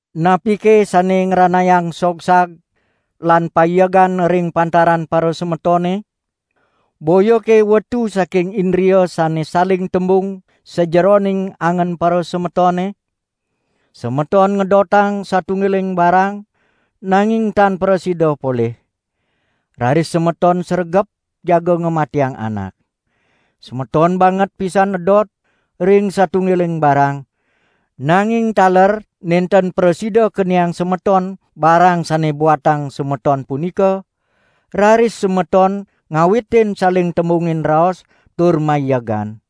Napike sane ngranayang sogsag lan paiegan ring pantaran parasemetone? Boyake wetu saking indria sane saling tembung sajeroning angen parasemetone? Semeton ngedotang satunggiling barang nanging tan prasida polih. Raris semeton sregep jaga ngamatiang anak. Semeton banget pisan edot ring satunggiling barang, nanging taler nenten prasida keniang semeton barang sane buatang semeton punika, raris semeton ngawitin saling tembungin raos, tur maiegan.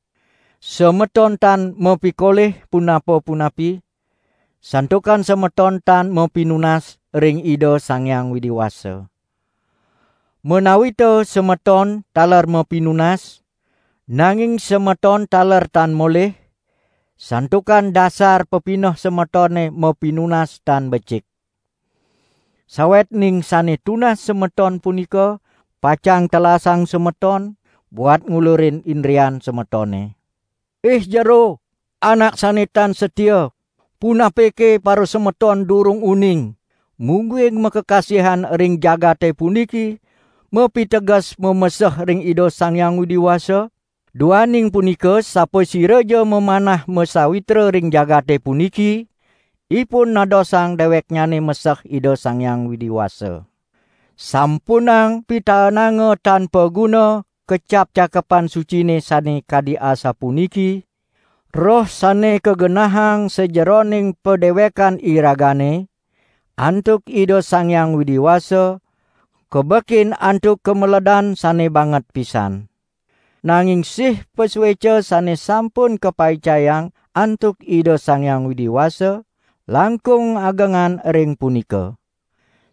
Semeton tan mapikolih punapa-punapi, santukan semeton tan mapinunas ring Ida Sang Hyang Widi Wasa. Menawita semeton taler mapinunas, nanging semeton taler tan molih, santukan dasar pepineh semetone mapinunas tan becik. Sawetning sane tunas semeton punika pacang telasang semeton buat ngulurin indrian semetone. Ih jero, anak sane tan satia! Punapike parasemeton durung uning, mungguing makakasihan ring jagate puniki mapiteges mameseh ring Ida Sang Hyang Widi Wasa? Duaning punika sapasiraja mamanah masawitra ring jagate puniki, ipun nadosang deweknyane meseh Ida Sang Hyang Widi Wasa. Sampunang pitaenanga tan paguna kecap Cakepan Sucine sane kadi asapuniki: "Roh sane kagenahang sajeroning padewekan iragane, antuk Ida Sang Hyang Widi Wasa, kabekin antuk kameledan sane banget pisan." Nanging sih pasueca sane sampun kapaicayang antuk Ida Sang Hyang Widi Wasa, langkung agengan ring punika.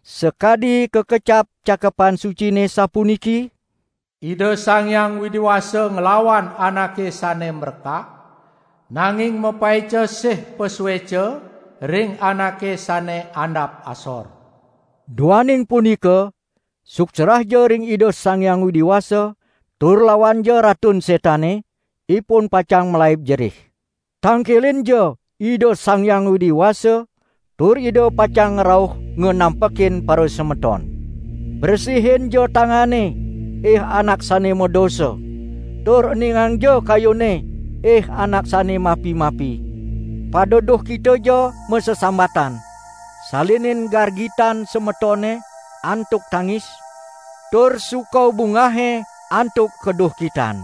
Sakadi kakecap Cakepan Sucine sapuniki: "Ida Sang Hyang Widi Wasa nglawan anake sane mrekak, nanging mapaica sih pasueca ring anake sane andap asor." Duaning punika suksrahja ring Ida Sang Hyang Widi Wasa, tur lawanja Ratun Setane, ipun pacang malaib jerih! Tangkilinja Ida Sang Hyang Widi Wasa, tur Ida pacang rauh nganampekin parasemeton. Bresihinja tangane, ih anak sane madosa! Tur eningangja kayune ih anak sane mapi-mapi! Pada duhkitaja masesambatan; salinin gargitan semetone antuk tangis, tur suka bungahe antuk kaduhkitan.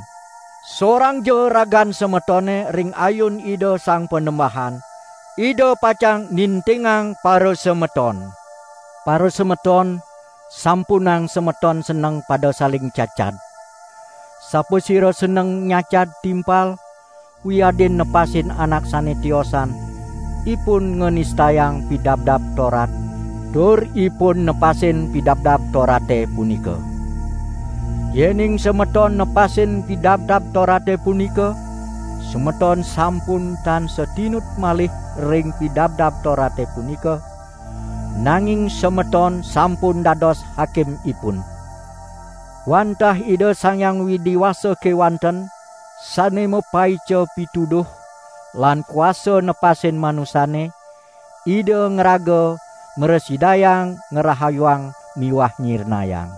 Sorangja ragan semetone ring ayun Ida Sang Panembahan, Ida pacang nintingang parasemeton. Parasemeton, sampunang semeton seneng pada saling cacad! Sapasira seneng nyacad timpal wiadin nepasin anak sane tiosan, ipun nganistayang Pidabdab Torat tur ipun nepasin Pidabdab Torate punika. Yening semeton nepasin Pidabdab Torate punika, semeton sampun tan satinut malih ring Pidabdab Torate punika, nanging semeton sampun dados hakimipun. Wantah Ida Sang Hyang Widi Wasa kewanten sane mapaica pituduh lan kuasa nepasin manusane, Ida ngraga mrasidayang ngrahayuang miwah nyirnayang.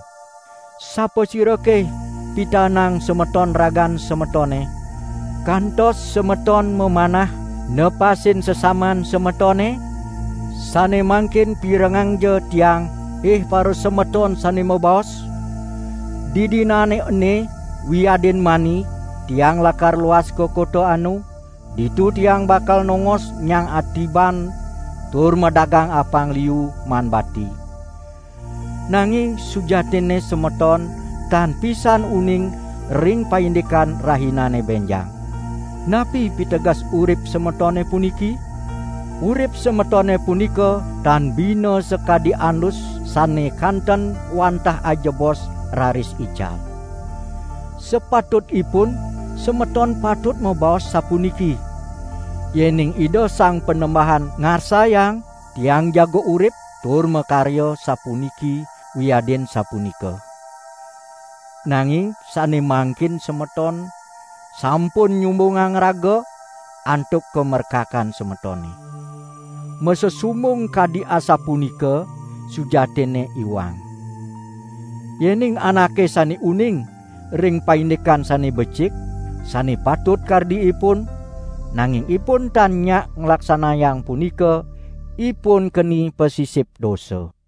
Sapasirake pitaenang semeton ragan semetone, kantos semeton mamanah nepasin sesaman semetone? Sane mangkin pirengangja tiang, ih parasemeton sane mabaos: "Didinane ene wiadin mani tiang lakar luas ka kota anu, ditu tiang bakal nongos nyang atiban tur madagang apang liu maan bati." Nanging sujatinne semeton tan pisan uning ring paindikan rahinane benjang. Napi piteges urip semetone puniki? Urip semetone punika tan bina sakadi andus sane kanten wantah ajebos raris ical. Sapatutipun semeton patut mabaos sapuniki: "Yening Ida Sang Panembahan ngarsayang, tiang jaga urip tur makarya sapuniki wiadin sapunika." Nanging sane mangkin semeton sampun nyumbungang raga antuk kamrekakan semetone. Masesumbung kadi asapunika sujatinne iwang. Yening anake sane uning ring paindikan sane becik sane patut kardi ipun, nanging ipun tan nyak nglaksanayang punika, ipun keni pasisip dosa.